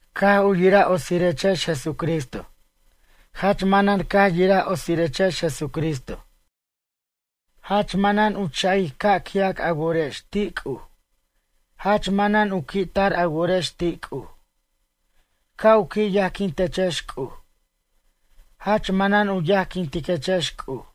Caj u yiraj otsirechex Jesucristo. Jach manan caj yiraj otsirechex Jesucristo. Jach manan u ch'a'ic ca' qui'ac a worex ti' C'uj, jach manan u qui' tar a worex ti' C'uj. Ca' u qui' yajquintechex C'uj. Jach manan u yajquintiquechex C'uj.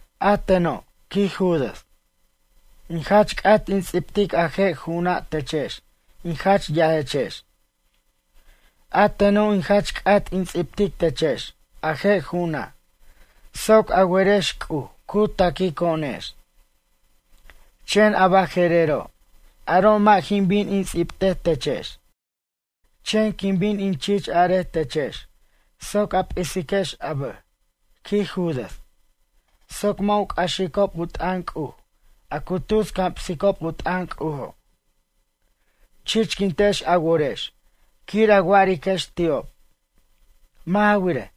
A teno', quij Judas. In jach c'at in ts'ibtic a je' ju'una' techex in jach yajechex. A teno' in jach c'at in ts'ibtic techex a je' ju'una' soc a werex C'uj cu taquico'onex. Chen a baje'rero' aro' mʌ' jin bin in ts'ibtej techex. Chen quin bin in chich arej techex soc a p'isiquex a bʌj, quij Judas, soc mʌ' u c'axicob u t'ʌn C'uj a cu tus camsicob u t'ʌn C'ujo'. Chichquintex a worex quir a wa'ariquex ti'ob. Mʌ' ja wirej,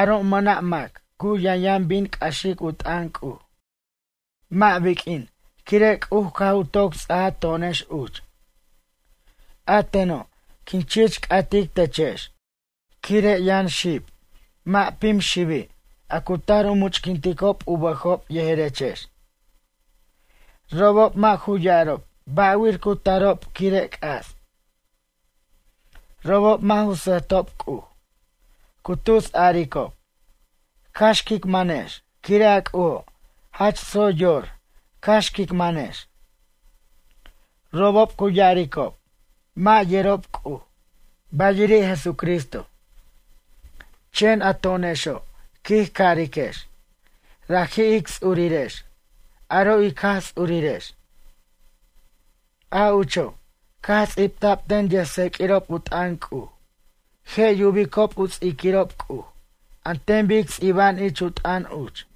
aro' mʌna' mac cu yʌnyʌn bin c'axic u t'ʌn C'uj. Mʌ' biq'uin quire' C'uj caj u toc ts'aja to'onex uch. A teno' quin chich c'atic techex quire' yʌn xib, mʌ' pim xibi' a cu tar u much'quintob u bʌjob yejerechex. Robob mʌ' ju ya'arob ba'wir cu tarob quire' c'as. Robob mʌ' ju sʌjtob C'uj. Cu tus a'aricob: “Cax quic manex quire' a C'ujo', jach tsoy yor cax quic manex.” Robob cu ya'aricob mʌ' yerob C'uj, bayiri' Jesucristo. Chen a to'onexo' quij cariquex: “Raji' ic ts'urirex, aro' ic Jaj Ts'urirex. A ucho', caj ts'ibta'b ten yʌjtseq'uirob u t'ʌn C'uj je' yubicob u ts'iquirob C'uj an ten bic ts'iba'an ich u t'ʌn uch.”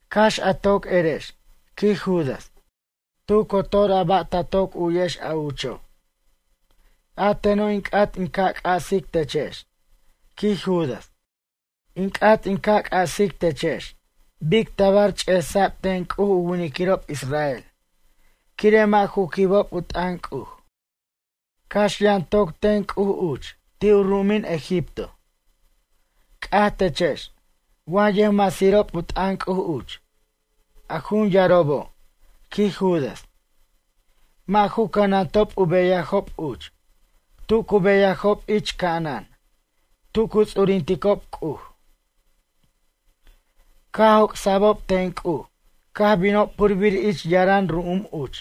Cax a toc erex, quij Judas, tu cotor a ba' ta toc u'yex a ucho'. A teno' in c'at in ca' c'asic techex, quij Judas. In c'at in ca' c'asic techex bic tabar ch'esa'b ten C'uj u winiquirob Israel quire' mʌ' ju quibob u t'ʌn C'uj. Cax yʌn toc ten C'uj uch ti' u ru'umin Egipto. C'aj techex wa yʌjmasirob u t'ʌn C'uj uch, a jun yarobo', quij Judas. Mʌ' ju cʌnantob u beyajob uch, tu cu beyajob ich ca'anan, tu cu ts'urinticob C'uj. Caj joc'sa'bob ten C'uj, caj binob purbir ich yaran ru'um uch.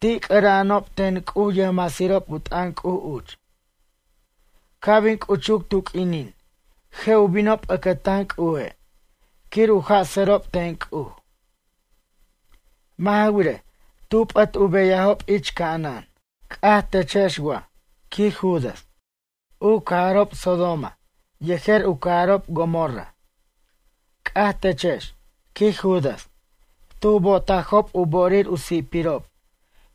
Ti' c'ʌra'anob ten C'uj yʌjmasirob u t'ʌn C'uj uch. Ca' bin c'uchuc tu q'uinin je' u binob ʌcʌtan C'uje' quir u jasʌrob ten C'uj. Mʌ' ja wirej, tu p'ʌt u beyajob ich ca'anan. C'aj techex wa, quij Judas, u cajarob Sodoma yejer u cajarob Gomorra. C'aj techex, quij Judas, tu bo'otajob u bo'orir u si'pirob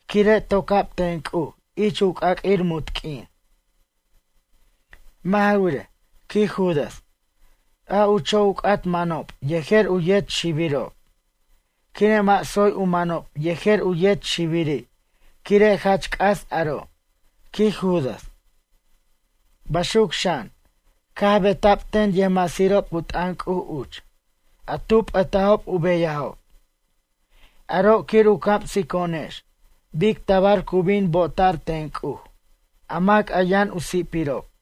quire' toca'b ten C'uj ich u c'aq'uir munt q'uin. Mʌ' ja wirej, quij Judas, a ucho' u c'at manob yejer u yet xibirob. Quire' mʌ' tsoy u manob yejer u yet xibiri' quire' jach c'as aro', quij Judas. Baxuc xan, caj beta'b ten yʌjmasirob u t'ʌn C'uj uch, a tu p'ʌtajob u beyajob. Aro' quir u camsico'onex bic tabar cu bin bo'ota'r ten C'uj a mac a yʌn u si'pirob.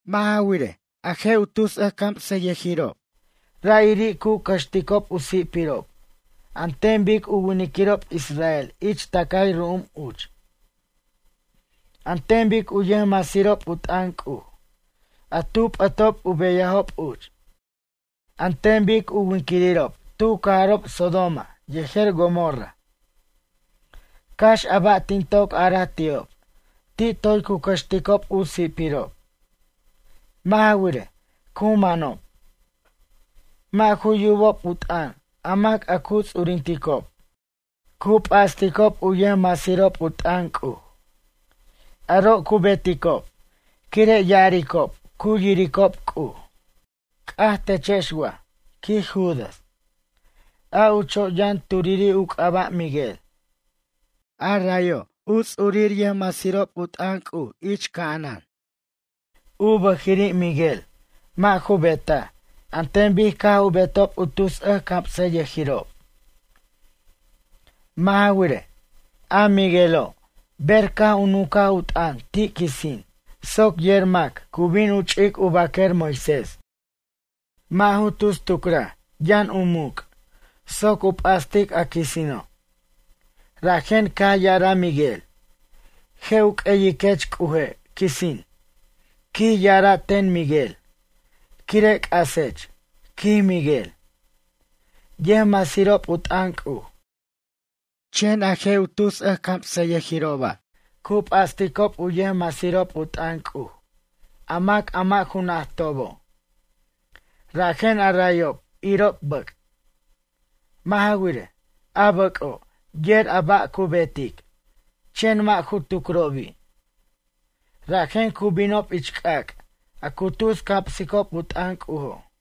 Mʌ' ja wirej, a je' tus camsʌyʌjirob ra'iri' cu cʌxticob u si'pirob an ten bic u winquirirob Israel ich tʌcay ru'um uch. An ten bic u yʌjmasirob u t'ʌn C'uj, a tu p'ʌtob u beyajob uch. An ten bic u winquirirob tu cajarob Sodoma yejer Gomorra. Cax a ba' tin toc araj ti'ob ti' toy cu cʌxticob u si'pirob. Mʌ' ja wirej, cu manob. Mʌ' ju yubob u t'ʌn a mac a cu ts'urinticob. Cu p'asticob u yʌjmasirob u t'ʌn C'uj. Aro' cu beticob quire' ya'aricob cu yiricob C'uj. C'aj techex wa, quij Judas. A ucho' yʌn turiri' u c'aba' Miguel. A rayo' u ts'urir yʌjmasirob u t'ʌn C'uj ich ca'anan. U bʌjiri' Miguel mʌ' ju betaj an ten bic caj u betob u tus camsʌyʌjirob. Mʌ' ja wirej, a Miguelo' ber caj u nunca u t'ʌn ti' quisin soc yer mac cu bin u ch'ic u baquer Moisés. Mʌ' ju tus tucraj yʌn u muc' soc u p'astic a quisino'. Rajen caj ya'araj Miguel: “Je' u q'ueyiquech C'uje' quisin, quij ya'ara' ten Miquel quire' c'asech”, quij Miguel, yʌjmasirob u t'ʌn C'uj. Chen a je' tus ʌjcamsʌyʌjiroba' cu p'asticob u yʌjmasirob u t'ʌn C'uj a mac a mʌ' ju najtobo'. Rajen arayob irob bʌc'. Mʌ' ja wirej, a bʌc'o' yer a ba' cu betic, chen mʌ' ju tucrobi'. Rajen cu binob ich c'ac' a cu tus camsicob u t'ʌn C'ujo'.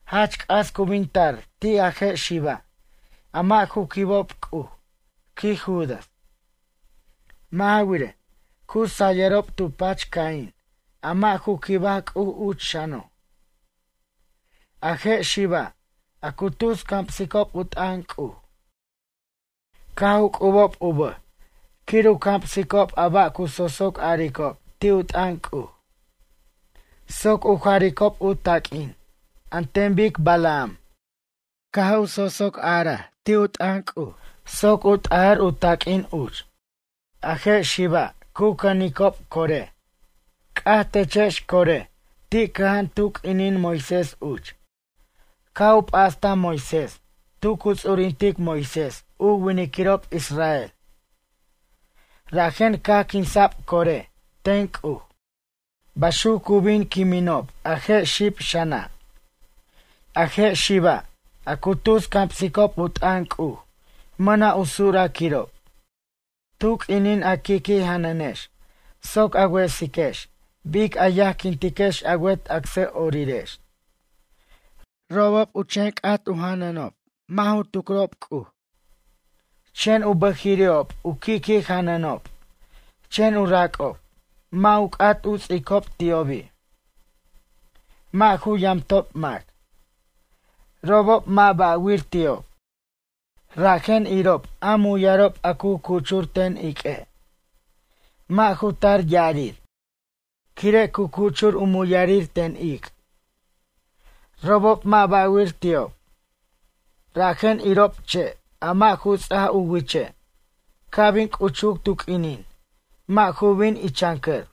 Jach c'as cu bin tar ti' a je' xiba' a mʌ' ju quibob C'uj, quij Judas. Mʌ' ja wirej, cu sayʌrob tu pach Caín a mʌ' ju quibaj C'uj uch xano'. A je' xiba' a cu tus camsicob u t'ʌn C'uj caj u c'ubob u bʌj quir u camsicob a ba' cu sosoc aricob ti' u t'ʌn C'uj. Soc u jaricob u taq'uin an ten bic Balaam caj u sosoc arbar ti' u t'ʌn C'uj soc u t'ajar u taq'uin uch. A je' xiba' cu cʌnicob Coré. C'aj techex Coré, ti' cʌja'an tu q'uinin Moisés uch. Caj u p'astaj Moisés tu cu ts'urintic Moisés u winquirirob Israel. Rajen caj quinsa'b Coré ten C'uj. Baxuc cu bin quiminob a je' xib xana'. A je' xiba', a cu tus camsicob u t'ʌn C'uj mʌna' u suraquirob. Tu q'uinin a qui' qui' janʌnex soc a wesiquex bic a yajquintex a wet acsʌ'orirex. Robob cu chen c'at u janʌnob, mʌ' ju tucrob C'uj. Chen u bʌjiri'ob u qui' qui' janʌnob chen u rac'ob mʌ' u c'at u ts'icob ti'obi'. Mʌ' ju yamtob mac. Robob mʌ' ba'wir ti'ob. Rajen irob a muyarob a cu cuchur ten iq'ue'. Mʌ' ju tar ya'arir quire' cu cuchur u muyarir ten ic'. Robob mʌ' ba'wir ti'ob. Rajen irob che' a mʌ' ju ts'aj u wiche' ca' bin c'uchuc tu q'uinin, mʌ' ju bin ichʌncʌr.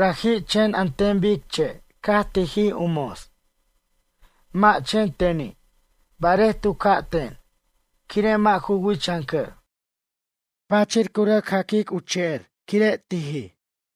Raji' chen an ten bic che' caj tijij u mos. Mʌ' chen teni' barej tu ca'ten, quire' mʌ' ju wichʌncʌr. Pachir cu rʌc jacaj u che'er quire' tijij.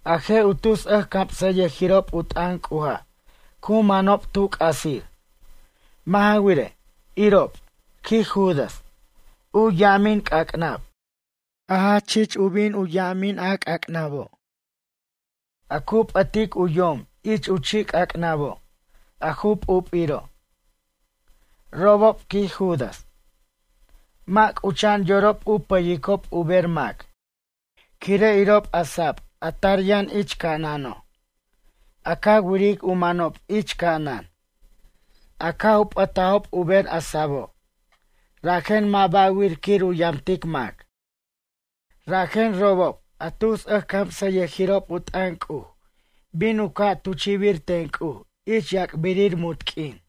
A je' u tus ʌjcamsʌyʌjirob u t'ʌn C'uja' cu manob tu c'asir. Mʌ' ja wirej, irob, quij Judas, u ya'amin c'ac'nab, a jach chich u bin u ya'amino' c'ac'nabo'. A cu p'ʌtic u yom ich u chi' c'ac'nabo', a ju p'up'iro'. Robob, quij Judas, mʌ' c'ucha'an yorob u pʌyicob u ber mac. Quire' irob a sa'ab a tar yʌn ich ca'anano'. A ca wiric u manob ich ca'anan, a caj u p'ʌtajob u ber a sa'abo', rajen mʌ' ba'wir quir u yamtic mac. Rajen robob a tus ʌjcamsʌyʌjirob u t'ʌn C'uj bin u ca' tuchi'bir ten C'uj ich yac'birir munt q'uin.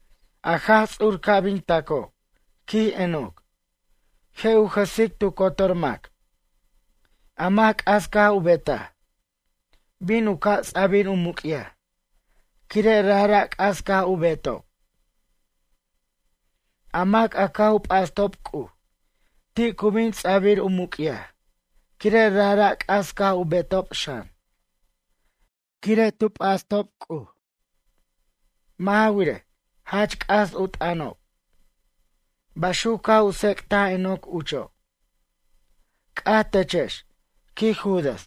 A Jaj Ts'ur ca' bin taco', quij Enoc. Je' u jʌsic tu cotor mac. A mac c'as caj u betaj, bin u ca' ts'abir u muc'yaj, quire' rajra' c'as caj u betob. A mac a caj u p'astob C'uj, ti' cu bin ts'abir u muc'yaj quire' rajra' c'as caj u betob xan, quire' tu p'astob C'uj. Mʌ' ja wirej, jach c'as u t'ʌnob”. Baxuc caj u tsec'taj Enoc ucho'. C'aj techex, quij Judas,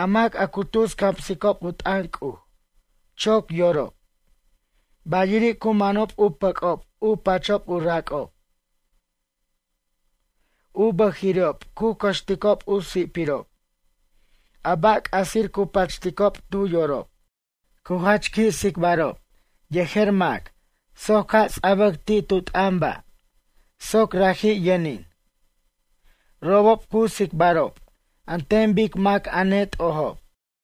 a mac a cu tus camsicob u t'ʌn C'uj, choc yorob. Bayiri' cu manob u pʌc'ob u pachob u rac'ob. U bʌjiri'ob cu cʌxticob u si'pirob, a ba' c'asir cu pachticob tu yorob. Cu jach qui' tsicbarob yejer mac soc ca' ts'abʌc ti' tu t'ʌn ba' soc raji' yʌnin. Robob cu tsicbarob an ten bic mac a net'ojob.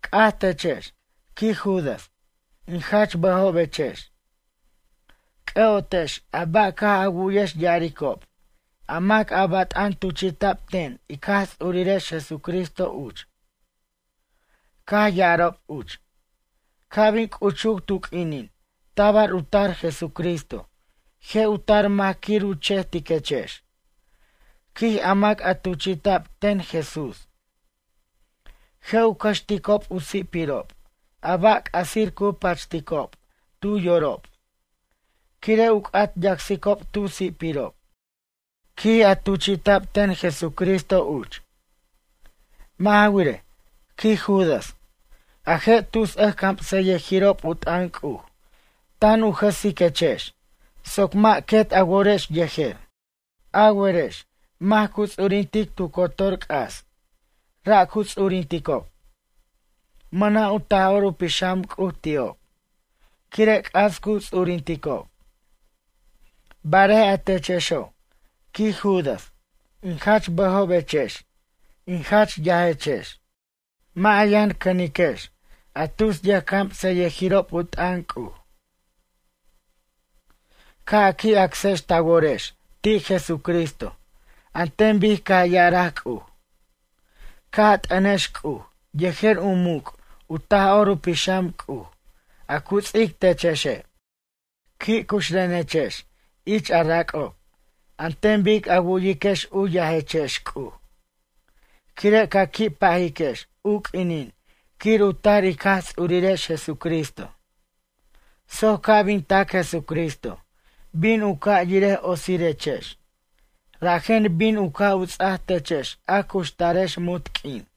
C'aj techex, quij Judas, in jach bʌjobechex. C'ʌ'otex a ba' caj a wu'yex ya'aricob a mac a bat'an tuchi'ta'b ten ic Jaj Ts'urirex Jesucristo uch. Caj ya'arob uch: “Ca' bin c'uchuc tu q'uinin tabar u tar Jesucristo je' u tar mac quir u chejtiquechex, quij a mac tuchi'ta'b ten Jesús. Je' u cʌxticob u si'pirob a ba' c'asir cu pachticob tu yorob quire' u c'at yacsicob tu si'pirob, quij a tuchi'ta'b ten Jesucristo uch.” Mʌ' ja wirej, quij Judas, a je' tus ʌjcamsʌyʌjirob u t'ʌn C'uj tan u jʌsiquechex soc mʌ' quet a worex yejer. A werex mac cu ts'urintic tu cotor c'as, ra' cu ts'urinticob. Mʌna' u Taj'or u Pixam C'uj ti'ob, quire' c'as cu ts'urinticob. Barej a techexo', quij Judas, in jach bʌjobechex in jach yajechex. Mʌ' a yʌn cʌniquex a tus yʌjcamsʌyʌjirob u t'ʌn C'uj. Ca' a qui' acsex ta worex ti' Jesucristo an ten bic caj ya'araj C'uj. Ca' a t'ʌnex C'uj yejer u muc' u Taj'or u Pixam C'uj a cu ts'ic techexe'. Qui' cuxrenechex ich a rac'ob an ten bic a wu'yiquex u yajechex C'uj. Quire' ca qui' pajiquex u q'uinin quir u tar ic Jaj Ts'urirex Jesucristo. Soc ca' bin tac Jesucristo bin u ca' yirej otsirechex, rajen bin u ca' u ts'aj techex a cuxtarex munt q'uin.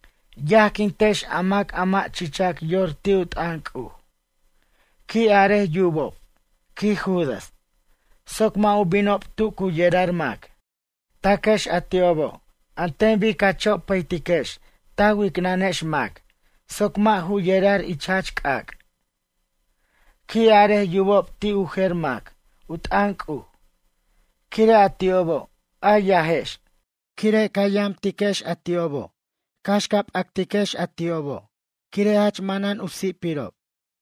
Yajquintex a mac a mʌ' chichac yor ti' u t'ʌn C'uj. Qui' arej yubob, quij Judas, soc mʌ' u binob tu cu yerar mac. Taquex a ti'obo' an ten bic ca chopʌytiquex ta wicnʌnex mac soc mʌ' ju yerar ich jach c'ac'. Qui' arej yubob ti' u jer mac u t'ʌn C'uj, quire' a ti'obo' a yajex quire' ca yamtiquex a ti'obo' cax ca p'atiquex a ti'obo' quire' jach manan u si'pirob.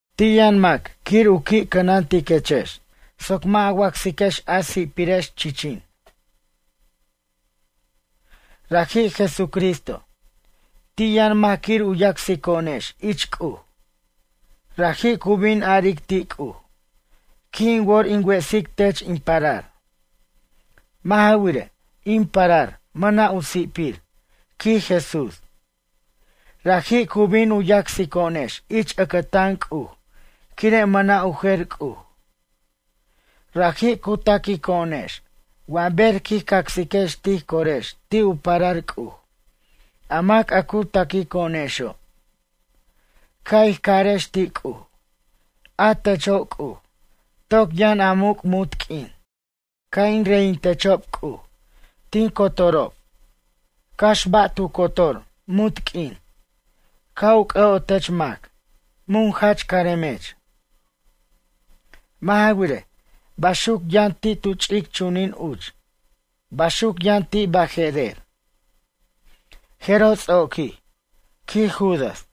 Ti' yʌn mac quir u qui' cʌnantiquechex soc mʌ' a wacsiquex a si'pirex, chichin. Raji' Jesucristo. Ti' yʌn mac quir u yacsico'onex ich C'uj. Raji' cu bin aric ti' C'uj: “Qui' in wor in wesic tech in parar. Mʌ' ja wirej, in parar mʌna' u si'pir”, quij Jesús. Raji' cu bin u yacsico'onex ich ʌcʌtan C'uj quire' mʌna' u jer C'uj. Raji' cu taquico'onex wa ber quij cacsiquex tij corex ti' u parar C'uj, a mac a cu taquico'onexo'. Ca' ij carex ti' C'uj: “A techo' C'uj, toc yʌn a muc' munt q'uin. Ca' in reyintechob C'uj tin cotorob cax ba' tu cotor munt q'uin. Ca' u c'ʌ'otech mac, mun jach caremech.” Mʌ' ja wirej, baxuc yʌn ti' tu ch'ic chunin uch, baxuc yʌn ti' baje'rer. Jeroj ts'oquij, quij Judas.